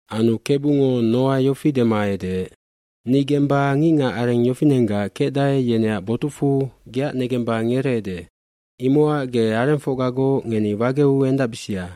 aAnu Kebungo Noa yofi dema edeec, “Ni gemba ngicngacareng yofinenggac kecdae yeneac botucfu geac negemba ngereede. Imocac ge arengfocgagoc ngeni wageu endacbisia.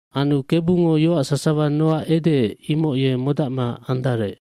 Anu Kebungo yoac sasawa Noa edeec imoc ye modacma andarec.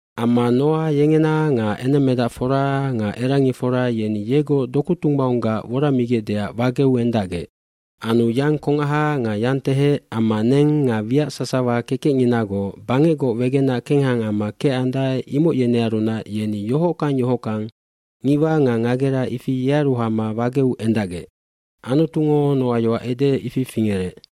bAmma Noa yengena nga enemmedacfora nga erangifora yeni yegoc doku tunggbaunggac woramigecdeac wageu endacgec. Anu yang kongaha nga yangtehec amma neng nga wiac sasawa kekecnginagoc bangecgoc wegenac kengha amma kecandae imoc yenearunac yeni yohockang yohockang ngiwa nga ngagera, ifi yearu hama wageu endacgec. Anutungo Noa yoac edeec, ifi fingerec.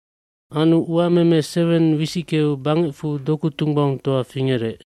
Anu uameme seweng wisickeu bangecfu doku tunggbaungtoa fingerec.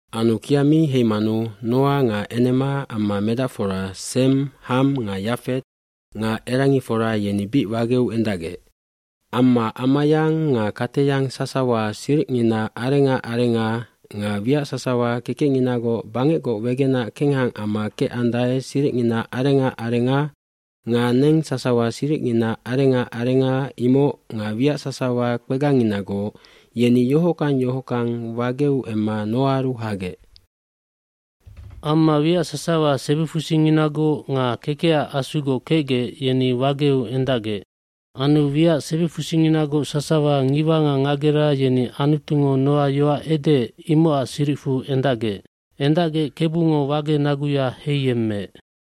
Anu kia mi heimanu Noa nga enema amma medacfora Sem, Ham nga Yafet nga erangifora yeni bic wageu endacgec. Amma amayang nga kateyang sasawa siricngina arenga arenga nga wiac sasawa kekecnginagoc bangecgoc wegenac kengha amma kecandae siricngina arenga arenga nga neng sasawa siricngina arenga arenga imoc nga wiac sasawa kpegangnginagoc, yeni yohockang yohockang wageu emma Noaaru hagec. Amma wiac sasawa sebifusinginagoc nga kekecac asugoc kecgec yeni wageu endacgec. Anu wiac sebifusinginagoc sasawa ngiwa nga ngagera yeni Anutungo Noa yoac edeec imocac siricfu endacgec. Endacgec Kebungo wage naguya heiyemmeec.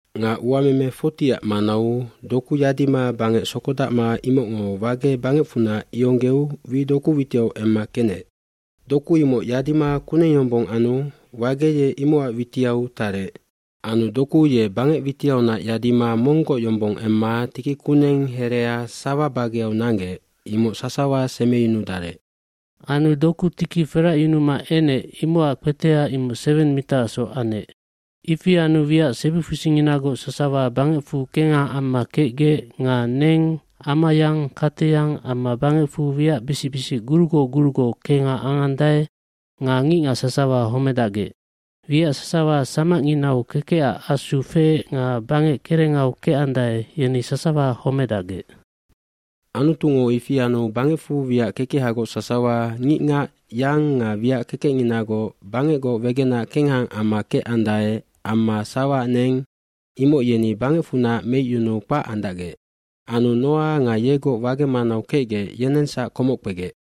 Nga uameme 40ac manau doku yadima bangec sokodacma imocngo wage bangecfunac ionggeu wi doku witiau emma kenec. Doku imoc yadima kuneng yombong anu wage ye imocac witiau tarec. Anu doku ye bangec witiaunac yadima monggoc yombong emma tiki kuneng herea sawa bageau nanggec imoc sasawa semeyunudarec. Anu doku tiki feracyunuma enec imocac kpeteha imoc seweng mitaacsoc anec. dIfi anu wiac sebifusinginagoc sasawa bangecfu kengha amma kecgec nga neng, amayang, kateyang amma bangecfu wiacbisic bisic gurugoc gurugoc kenghaangandae nga ngicngac sasawa homedacgec. Wiac sasawa samacnginau kekecac asu feec nga bangec kerengau kecandae yeni sasawa homedacgec. eAnutungo ifi anu bangecfu wiac kekehagoc sasawa, ngicngac, yang nga wiac kekecnginagoc bangecgoc wegenac kengha amma kecandae amma sawaac neng imoc yeni bangecfunac meicyunuu kpac andacgec. Anu Noa nga yegoc wage manau kecgec yenengsac komoc kpegec.